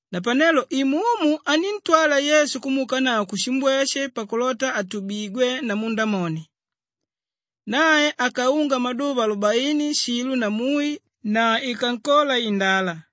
Napanelo Imumu aníntwala Yesu kumuukanavo kushimbweshe pakulota atubigwe namu Ndamoni. Nae akaunga maduva alubaini shilo na mui na ikankola indala.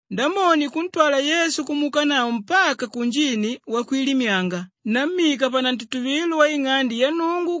Ndamoni kuntwala Yesu kumuukanavo mpaka kunjini wakwilimyanga nammika panantutuvilo waing'ande ya Nnungu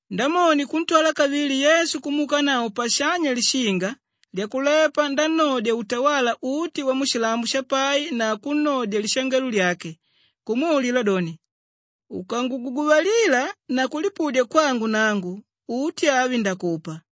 Ndamoni kuntwala kavili Yesu kumuukanavo pashanya lishinga lyakulepa nannodya utawala uti wamushilambo shapai na kunnodya lishangelo lyake kumwaulila doni, “Ukanguguguvalila na kulipudya kwangu nangu, uti avi ndakupa.”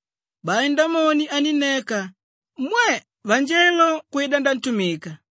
Bai Ndamoni anínneka. Mwe! Vanjelo kwida nantumika.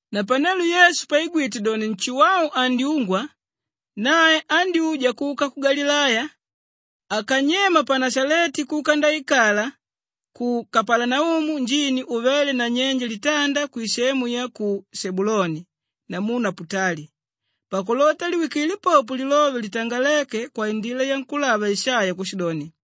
Napanelo Yesu paigwite doni Nshuwau andyungwa, nae andyúja kuka ku Galileya. Akanyema pa Nashaleti kuka ndaikala ku Kapalanaumu njini uvéle nanyenje litanda kwisemu ya ku Shebuluni namu Naputali pakulota liwikile popo lilove litangaléke kwaindila yankúlava Ishaiya kushidoni,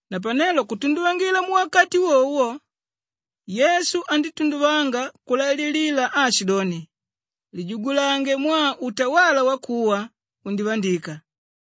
Napanelo kutunduvangila muwakati wowo wo, Yesu andítunduvanga kulaililila aashidoni, “Lijugulange mwaa utawala wakuwa undivandika.”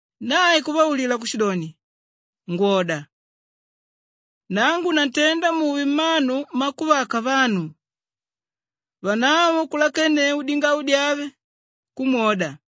Nae kuvaulila kushidoni, “Ngwoda! Nangu nantenda muve mmanu mmakuvaka vanu.” Vanavo kulakenneu dingau dyave, kumwoda.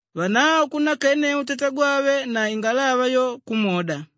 Vanavo kunnakenneu tatagwave na ingalava yo, kumwoda.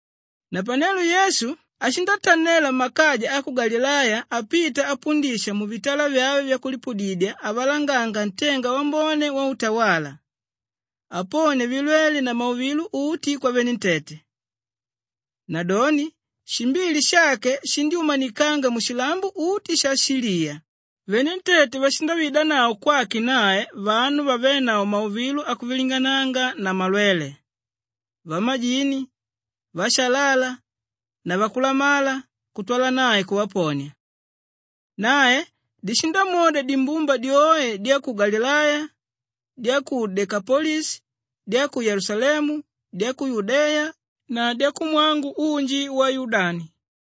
Napanelo Yesu ashindatanela makaja a ku Galileya apita apundisha muvitala vyave vyakulipudidya avalanganga ntenga wambone wautawala, aponia vilwele na mauvilo uti kwavenentete. Nadoni shimbili shake shindyúmanikanga mushilambo uti sha Shiliya, venentete vashindavaidanavo kwake nae vanu vavénavo mauvilo akuvilingananga na malwele, vamajini, vashalala na vakulamala kutwala nae kuvaponia. Nae dishindamwoda dimbumba dyoe dya ku Galileya, dya ku Dekapolishi, dya ku Yelusalemu, dya ku Yudeya na dyakumwangu unji wa Yudani.